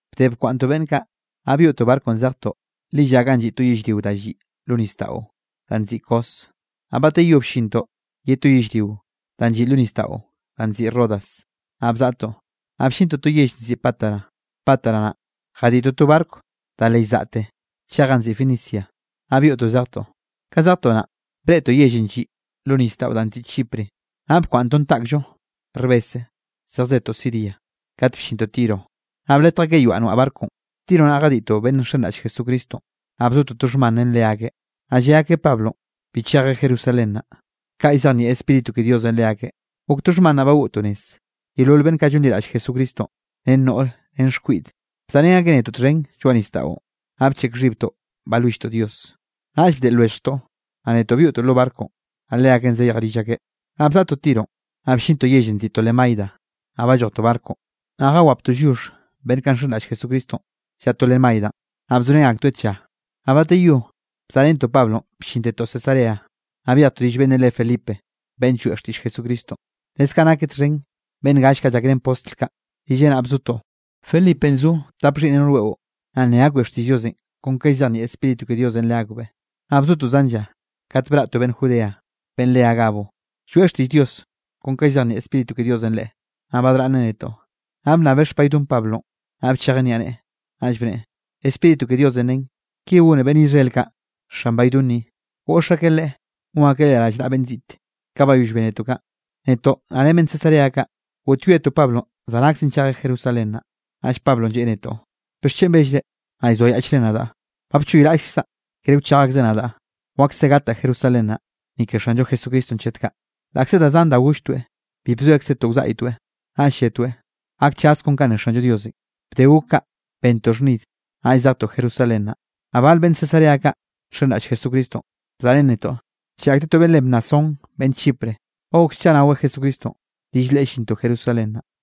Bde bkwaꞌnntoꞌ beꞌnn kaꞌ, naꞌ byoꞌtoꞌ barconꞌ zejtoꞌ lilla ganꞌ lliꞌ to yellrio danꞌ lliꞌ lo nisdaꞌon danꞌ nziꞌi Cos. Naꞌ bateyó bllintoꞌ ye to yellrio danꞌ lliꞌ lo nisdaꞌo danꞌ nziꞌi Rodas, naꞌ bzaꞌtoꞌ, naꞌ bllintoꞌ to yell nziꞌi Pátara. Pátara naꞌ, jadiꞌtoꞌ to barco da le llzaꞌte chej ganꞌ nziꞌi Fenicia, naꞌ byoꞌtoꞌ zejtoꞌ. Ka zejtoꞌ naꞌn, breꞌtoꞌ yellenꞌ lliꞌ lo nisdaꞌon danꞌ nziꞌi Chipre, naꞌ bkwaꞌnntoꞌn taꞌkllo rbese zejzetoꞌ Siria. Kat bllintoꞌ Tiro naꞌ bletj akeꞌ yoaꞌ noaꞌ barconꞌ. Tiro naꞌ jadiꞌtoꞌ beꞌnn nxenraꞌll Jesucristonꞌ, naꞌ bzotoꞌ to xhman ren leakeꞌ. Naꞌ lle akeꞌ Pablonꞌ bi chejeꞌ Jerusalén naꞌ, kaꞌ llzejnieꞌ Spíritu ke Diosenꞌ leakeꞌ. Gok to xhman naꞌ bagoꞌtoꞌ nez. Yeolol beꞌnn kaꞌ llonliraꞌll Jesucristonꞌ ren noꞌr ren xkwiꞌd, bzaꞌrén akeꞌ netoꞌ txhen lloaꞌ nisdaꞌon, naꞌ bcheꞌk xhibtoꞌ balwilltoꞌ Dios. Naꞌll bdeꞌl lwelljtoꞌ, naꞌ netoꞌ byoꞌtoꞌ lo barconꞌ, naꞌ leakeꞌn zayej rill akeꞌ. Naꞌ bzaꞌtoꞌ Tiro, naꞌ bllintoꞌ yellenꞌ nziꞌi Tolemaida, naꞌ ballojtoꞌ barconꞌ, naꞌ jawaptoꞌ lliox beꞌnn kaꞌ nxenraꞌll Jesucristonꞌ llaꞌa Tolemaidanꞌ, naꞌ bzorén aktoeꞌ tlla. Naꞌ bateyó bzaꞌrentoꞌ Pablonꞌ bllintetoꞌ Cesarea, naꞌ byejtoꞌ rill beꞌnnenꞌ re Felipe beꞌnn lloeꞌ xtiꞌll Jesucristonꞌ, leskaꞌ nakeꞌ txhen beꞌnn gall kaꞌ llakrén postl kaꞌ, rilleꞌ naꞌ bzotoꞌ. Felipenꞌ zo tap xhiꞌnneꞌ noꞌr weꞌo, naꞌ nne akbeꞌ xtiꞌll Diosenꞌ kon ka llzejnieꞌ Spíritu ke Diosenꞌ leakbeꞌ. Naꞌ bzotoꞌ zan lla, kat braꞌ to beꞌnn Judea beꞌnn re Agabo, lloeꞌ xtiꞌll Dios kon ka llzejnieꞌ Spíritu ke Diosenꞌ leꞌe. Naꞌ badraꞌnneꞌ netoꞌ, naꞌ bnnabeꞌ xpaydon Pablonꞌ, naꞌ bchejeꞌn niaꞌneꞌe, naꞌll bneꞌe: —Spíritu ke Diosenꞌ ne, ki gone beꞌnn Israel kaꞌ xan baydon ni, goꞌx akeꞌ leꞌe gon akeꞌ leꞌe rallnaꞌa beꞌnn ziꞌte. Ka bayoll bénetoꞌ kaꞌ, netoꞌ naꞌ ren beꞌnn Cesarea kaꞌ, goꞌtyoetoꞌ Pablonꞌ zanakzen chejeꞌ Jerusalén naꞌ. Naꞌll Pablonꞌ lleꞌe netoꞌ: —¿Bixchen bellre, naꞌ llzoayaꞌchre nadaꞌ? Ba bchoyraꞌllkzaꞌ kere wchej akzeꞌ nadaꞌ, wakse gataꞌ Jerusalén naꞌ, ni ke Xanllo Jesucristonꞌ chet kaꞌ. Laꞌkze da zan da golltoeꞌ, bi bzoekzetoꞌ wzaꞌytoeꞌ, naꞌll lletoeꞌ: —Gakchaz kon kanꞌ ne Xanllo Diosenꞌ. Bde gok kaꞌ, bentoꞌ xhnid, naꞌll zejtoꞌ Jerusalén naꞌ. Naꞌ bal beꞌnn Cesarea kaꞌ nxenraꞌll Jesucristonꞌ, bzaꞌrén netoꞌ ncheꞌe akteꞌ to beꞌnn re Mnasón beꞌnn Chipre, ba gok scha naweꞌ Jesucristonꞌ, rill leꞌe llintoꞌ Jerusalén naꞌ.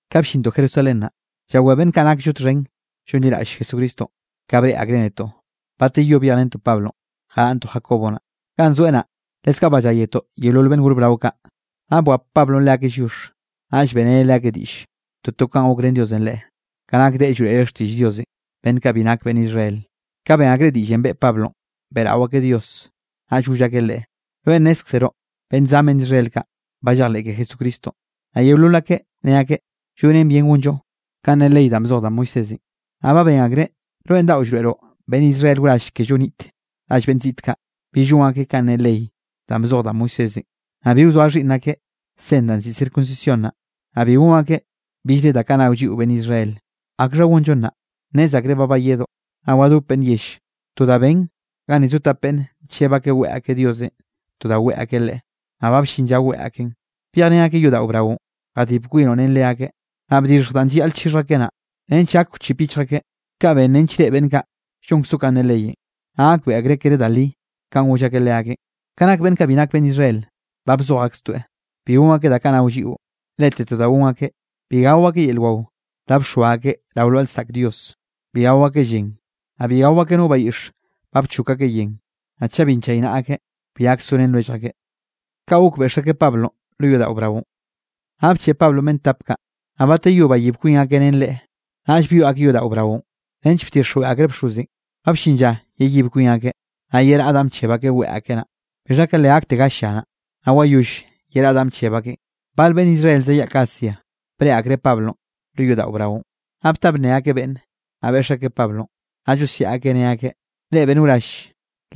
Ka bllintoꞌ Jerusalén naꞌ, llawé beꞌnn kaꞌ nakllo txhen llonliraꞌll Jesucristonꞌ, ka breꞌe akreꞌ netoꞌ. Bateyó byejrentoꞌ Pablonꞌ, jaraꞌnntoꞌ Jacobo naꞌ, ganꞌ zoeꞌ naꞌ, leskaꞌ balláyetoꞌ yeolol beꞌnn gor brao kaꞌ. Naꞌ bwap Pablonꞌ leakeꞌ lliox, naꞌll beꞌreneꞌ leakeꞌ diꞌll toto kanꞌ gokrén Diosenꞌ leꞌe, ka nak deꞌe llroeꞌreꞌ xtiꞌll Diosenꞌ beꞌnn kaꞌ bi nak beꞌnn Israel. Ka ben akreꞌ diꞌllenꞌ beꞌe Pablonꞌ, beꞌrao akeꞌ Dios, naꞌll goll akeꞌ leꞌe: —Rweꞌ nnézkzeroꞌ beꞌnn zan beꞌnn Israel kaꞌ, ba llejleꞌ ke Jesucristonꞌ, naꞌ yeolol akeꞌ ne akeꞌ llonen bien gonllo kanꞌ ne ley danꞌ bzoj da Moisésenꞌ. Naꞌ ba ben akreꞌ, rweꞌn daꞌo llroeꞌroꞌ beꞌnn Israel wrall kello niꞌt rall beꞌnn ziꞌt kaꞌ, bill gon akeꞌ kanꞌ ne ley danꞌ bzoj da Moisésenꞌ, naꞌ bi wzoa xhiꞌnn akeꞌ sen danꞌ nziꞌi circuncisión naꞌ, naꞌ bi gon akeꞌ billre da kaꞌ nao lliꞌo beꞌnn Israel. ¿Akxha gonllo nnaꞌ? Nnez akreꞌ ba bayedoꞌ, naꞌ wadop beꞌnn yell. To da ben, ganni zo tap beꞌnne ncheb akeꞌ weꞌe akeꞌ Diosenꞌ to da weꞌe akeꞌ Leꞌe, naꞌ ba bllin lla weꞌe akeꞌn. Byejrén akeꞌ yodaꞌo braonꞌ, jadib kwinoꞌ ren leakeꞌ, naꞌ bdixhj danꞌ llayaꞌl chixhj akeꞌ naꞌ, nench gak wchip yichj akeꞌ. Kaꞌ ben nench reꞌe beꞌnn kaꞌ llonkzoꞌ kanꞌ ne leyenꞌ, naꞌ gakbeꞌe akreꞌ kere da li kanꞌ goll akeꞌ leakeꞌn. Ka nak beꞌnn kaꞌ bi nak beꞌnn Israel, ba bzoj akstoeꞌ, bi gon akeꞌ da kaꞌ nao lliꞌo. Lete to da gon akeꞌ, bi gao akeꞌ yel wao da bxoa akeꞌ rao lwaꞌa lsaꞌk dios, bi gao akeꞌ llen, naꞌ bi gao akeꞌ no bayiꞌx ba llchok akeꞌ yen, naꞌ chaꞌ bi nchaynaꞌa akeꞌ, bi gak sorén lwellj akeꞌ. Naꞌ bcheꞌe Pablonꞌ beꞌnn tap kaꞌ, naꞌ bateyó bayib kwin akeꞌ ren leꞌe. Naꞌll byoꞌ akeꞌ yodaꞌo braonꞌ, nench bdixjweꞌ akreꞌ bxozenꞌ ba bllin lla yeyib kwin akeꞌ, naꞌ yeraꞌ danꞌ bcheb akeꞌ weꞌe akeꞌ naꞌ. Bixha ka le gakte gall lla, naꞌ wayoll yeraꞌ danꞌ bcheb akeꞌn, bal beꞌnn Israel zayaꞌk Asia, breꞌe akreꞌ Pablonꞌ lo yodaꞌo braonꞌ, naꞌ bta bnne akeꞌ beꞌnn, naꞌ beꞌx akeꞌ Pablonꞌ. Naꞌ llosiaꞌ akeꞌ ne akeꞌ: —¡Reꞌ beꞌnn wrall,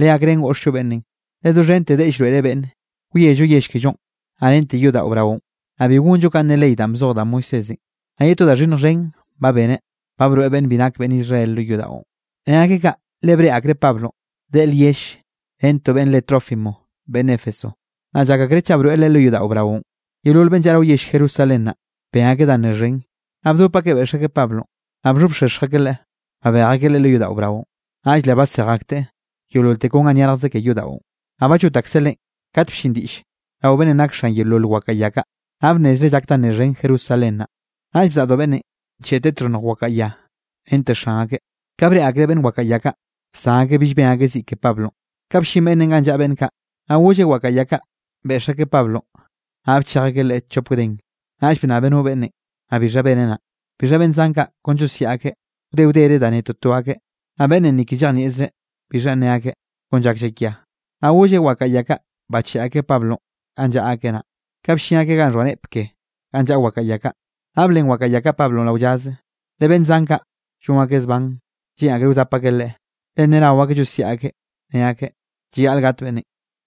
legakrén goꞌxllo beꞌnnenꞌ! Leꞌe doxhente deꞌe llroeꞌreꞌ beꞌnne, wiello yell kellonꞌ, naꞌ rente yodaꞌo braonꞌ, naꞌ bi gonllo kanꞌ ne ley danꞌ bzoj da Moisésenꞌ. Naꞌ ye to da xhinnj xhen ba beneꞌ, ba broeꞌ beꞌnn bi nak beꞌnn Israel lo yodaꞌon. Ne akeꞌ kaꞌ, le breꞌe akreꞌ Pablonꞌ deꞌe lyell ren to beꞌnn re Trófimo beꞌnn Éfeso, naꞌ llak akreꞌ chaꞌ broeꞌ leꞌe lo yodaꞌo braonꞌ. Yeolol beꞌnn llaꞌa rao yell Jerusalén naꞌ, ben akeꞌ da nne xhen, naꞌ bdop akeꞌ beꞌx akeꞌ Pablonꞌ. Naꞌ bxhobxexj akeꞌ leꞌe, babej akeꞌ leꞌe lo yodaꞌo braonꞌ, naꞌll le basej akteꞌ yeololte kon ga nyarjkze ke yodaꞌon. Naꞌ ba llot akseꞌ leꞌen, kat bllin diꞌll rao beꞌnnenꞌ nak xan yeolol wakaꞌa ya kaꞌ, naꞌ bnnezreꞌ llak da nne xhen Jerusalén naꞌ. Naꞌll bzaꞌdo beꞌnnenꞌ ncheꞌteꞌ txhonnj wakaꞌa ya rente xan akeꞌ. Ka breꞌe akreꞌ beꞌnn wakaꞌa ya kaꞌ, bsan akeꞌ bill ben akeꞌ ziꞌ ke Pablonꞌ. Ka bllin beꞌnnenꞌ ganꞌ llaꞌa beꞌnn kaꞌ, naꞌ golleꞌ wakaꞌa ya kaꞌ beꞌx akeꞌ Pablonꞌ, naꞌ bchej akeꞌ leꞌe chop gden. Naꞌll bnnabeꞌ no beꞌnnenꞌ, naꞌ bixha beneꞌ naꞌ. Bixha beꞌnn zan kaꞌ kon llosiaꞌ akeꞌ, wde wdere da ne toto akeꞌ, naꞌ beꞌnnenꞌ ni ke llejnieꞌzreꞌ bixhanꞌ ne akeꞌ, kon llak llakia. Naꞌ golleꞌ wakaꞌa ya kaꞌ bacheꞌe akeꞌ Pablonꞌ ganꞌ llaꞌa akeꞌ naꞌ. Ka bllin akeꞌ ganꞌ xhoa neꞌp ke ganꞌ llaꞌa wakaꞌa ya kaꞌ, naꞌ blen wakaꞌa ya kaꞌ Pablonꞌ rao llaze, le beꞌnn zan kaꞌ llon akeꞌ zban, lleꞌn akreꞌ wzap akeꞌ leꞌe. Le ne nao akeꞌ llosiaꞌ akeꞌ ne akeꞌ: —¡Llayaꞌl gat beꞌnnenꞌ!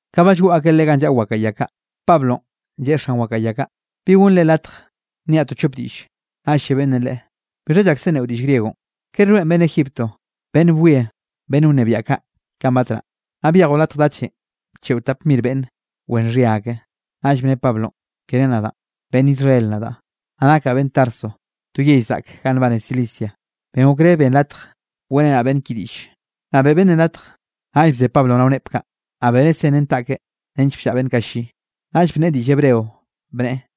Ka ba llgoꞌ akeꞌ leꞌe ganꞌ llaꞌa wakaꞌa ya kaꞌ, Pablonꞌ lleꞌe xan wakaꞌa ya kaꞌ: —¿Bi gonnre latj nniaꞌ to chop diꞌlle? Naꞌ lle beꞌnnenꞌ leꞌe: —¿Bixha llakse nneꞌo diꞌll griegonꞌ? ¿Kere rweꞌn beꞌnn Egipto beꞌnn bwie beꞌnn wnebiaꞌ kaꞌ kanꞌ batnaꞌ, naꞌ byejoꞌ latj dachenꞌ bcheꞌo tap mir beꞌnn wen xhia ake? Naꞌll bne Pablonꞌ: —Kere nadaꞌn, beꞌnn Israel nadaꞌ, naꞌ nakaꞌ beꞌnn Tarso to yell zaꞌk ganꞌ nbane Cilicia, ben okré benn latj weꞌrenaꞌ beꞌnn ki diꞌlle. Naꞌ beꞌe beꞌnnenꞌ latj. Naꞌll bze Pablonꞌ rao neꞌp kaꞌ, naꞌ beneꞌ sen ren taꞌkeꞌ nench bllaꞌa beꞌnn kaꞌ lli, naꞌll bnneꞌe diꞌll hebreo bneꞌe: